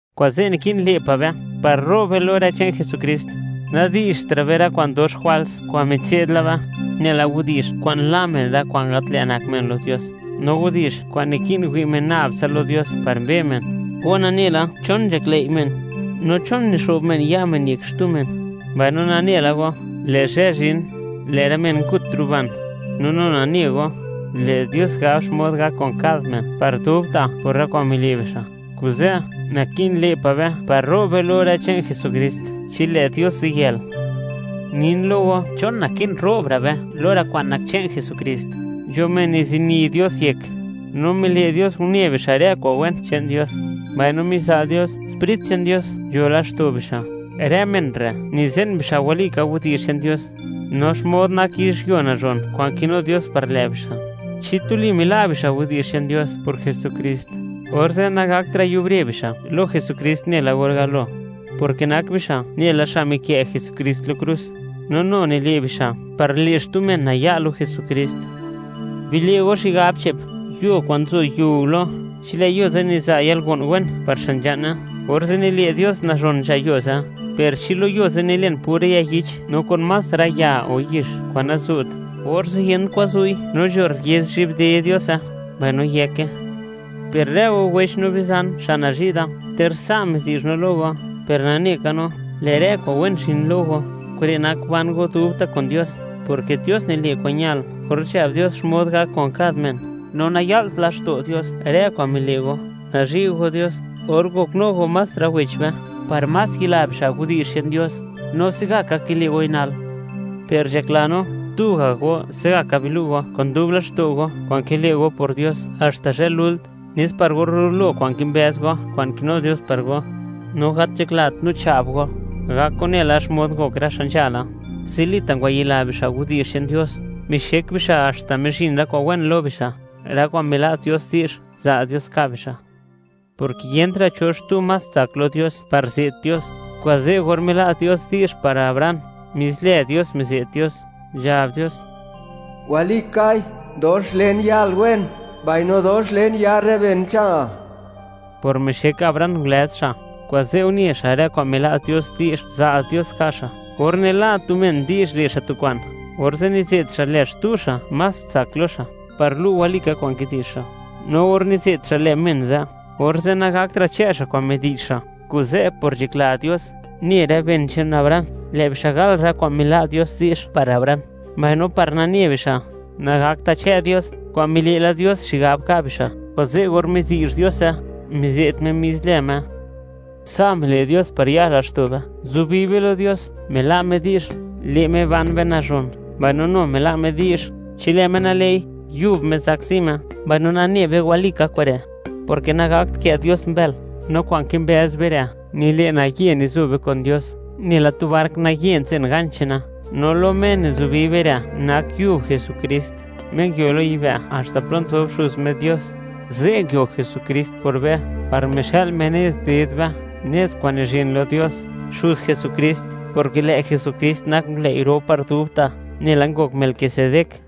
Kuze', naki'n le' pa' be par ro'b be lo rë che'n Jesukrist. Nadi'zhtra' be rë kwa'n dox jwals kwa'n mitse'd la be, nela widi'zh kwa'n la' men rë kwa'n gat lë' nak men lo Dios, no widi'zh kwa'n naki'n wi' men nab tsa lo Dios par mbe men. Go nane la chon nzhaklëi' men, no chon nixo'b men ya' men yek xtu men; mbaino nane la go, lë' zhë zhin, lë' rë men ngut ruban; no nu nane go, lë' Dios gab xmod gak kun kad men par dubta' por rë kwa'n mile' bixa'. Kuze', naki'n le' pa' be par ro'b be lo rë che'n Jesukrist chi lë' Dios ziyël. Nin lo go chon naki'n ro'bra' be lo rë kwa'n nak che'n Jesukrist. Nzho men nizini Dios yek, no mile' Dios une bixa' rë kwa'n wen che'n Dios, mbaino miza' Dios, Sprit che'n Dios nzho laxto' bixa'. Rë men re' nize'n bixa' walika widi'zh che'n Dios, no xmod nak yizhyuo nazhon kwa'n kinu Dios par lë' bixa'; chi tuli mila' bixa' widi'zh che'n Dios por Jesukrist, orze' nagaktra' yubre bixa' lo Jesukrist nela or galo, porke nak bixa' nela xa' mikë' Jesukrist lo krus, no nu nile' bixa' par le' xtu men naya' lo Jesukrist. Bile' go xigab che'p: yuo kwa'n nzo yiu lo, chi lë' yuo ze' niza' yalgo'n wen par xa' nzha'ne, orze' nile' Dios nazhon nzha yuo ze'; per chi lo yuo ze' nilen pura ya yich no kun más rë ya o yix kwa'n nazu't, orze' yent kwan zu'i no nzho rriez zhi'bde Diose, mbaino yëke. Per rë go wech no bizan xa' nazhi' da, ter sa' midi'zh no lo go, per nane ka no, lë' rë kwa'n wen zhin lo go, kure' nak ban go dubta' kun Dios, porke Dios nile' kwa'n ñal or nzhab Dios xmod gak kun kad men, no naya'lt laxto' Dios rë kwa'n mile' go, nazhi' go Dios or ngoknu go más rë wech be, par más yila bixa' widi'zh che'n Dios, no se'gaka kile' goi nal. Per nzhakla no, tu ga' go se'gaka bilu' go kun dub laxto' go kwa'n kile' go por Dios haxta zhë lult, nes par rulo kwa'n kimbëz go, kwa'n kinu Dios par go. No gat nzhaklat no cha'b go; gok go nela xmod ngok rë xa' nzhala: zilita' ngwayila bixa' widi'zh che'n Dios, mixek bixa' haxta mizhin rë kwa'n wen lo bixa', rë kwa'n mila' Dios di'zh, za' Dios ka' bixa'. Porke yentra' cho xtu más tsak lo Dios par ze't Dios, kuze', or mila' Dios di'zh par Abraham, mis lë Dios mize't Dios, nzhab Dios: Walikai, dox len yal wen, mbaino dox len yar rë benal. Por mixek Abraham ngulëz xa', kuze' une xa' rë kwa'n mila' Dios di'zh za' Dios ka' xa'. Or nila' tu men di'zh le' xa' tu kwa'n, orze' nize't xa' lë xtu xa' más tsak lo xa', par lu' walika kwa'n kidi'zh xa'; no or nize't xa' lë men ze', orze' nagaktra' chë' xa' kwa'n midi'zh xa'. Kuze', por nzhakla Dios, ne rë ben che'n Abraham, lë' bixa' gal rë kwa'n mila' Dios di'zh par Abraham, mbaino par nane bixa', nagakt chë' Dios kwa'n mile' la Dios xigab ka' bixa', kuze' or midi'zh Diose, mize't Me mis lë Me. Sa' mile' Dios par ya laxto' be, zubi be lo Dios: Mila' Me di'zh, le' Me ban be nazhon, mbaino nu mila' Me di'zh, chi lë' Me nale'i, yub Me zakzi Me. Mbaino nane be walika kure', porke nagakt kë' Dios mbël. No kwa'n kimbëz be re', nile' naye nizo be kun Dios, nela tu bark naye nzen ganch che'ne; no lo Me nizubi be re' nak yub Jesukrist, Me nguio lo yibë' haxta plo nzob Xuz Me Dios. Ze' nguio Jesukrist por be, par mixa'l Me nez ded be, nez kwa'n nizhin lo Dios, Xuz Jesukrist, porke lë' Jesukrist nak ngulëi' ro par dubta', nela ngok Melquisedec.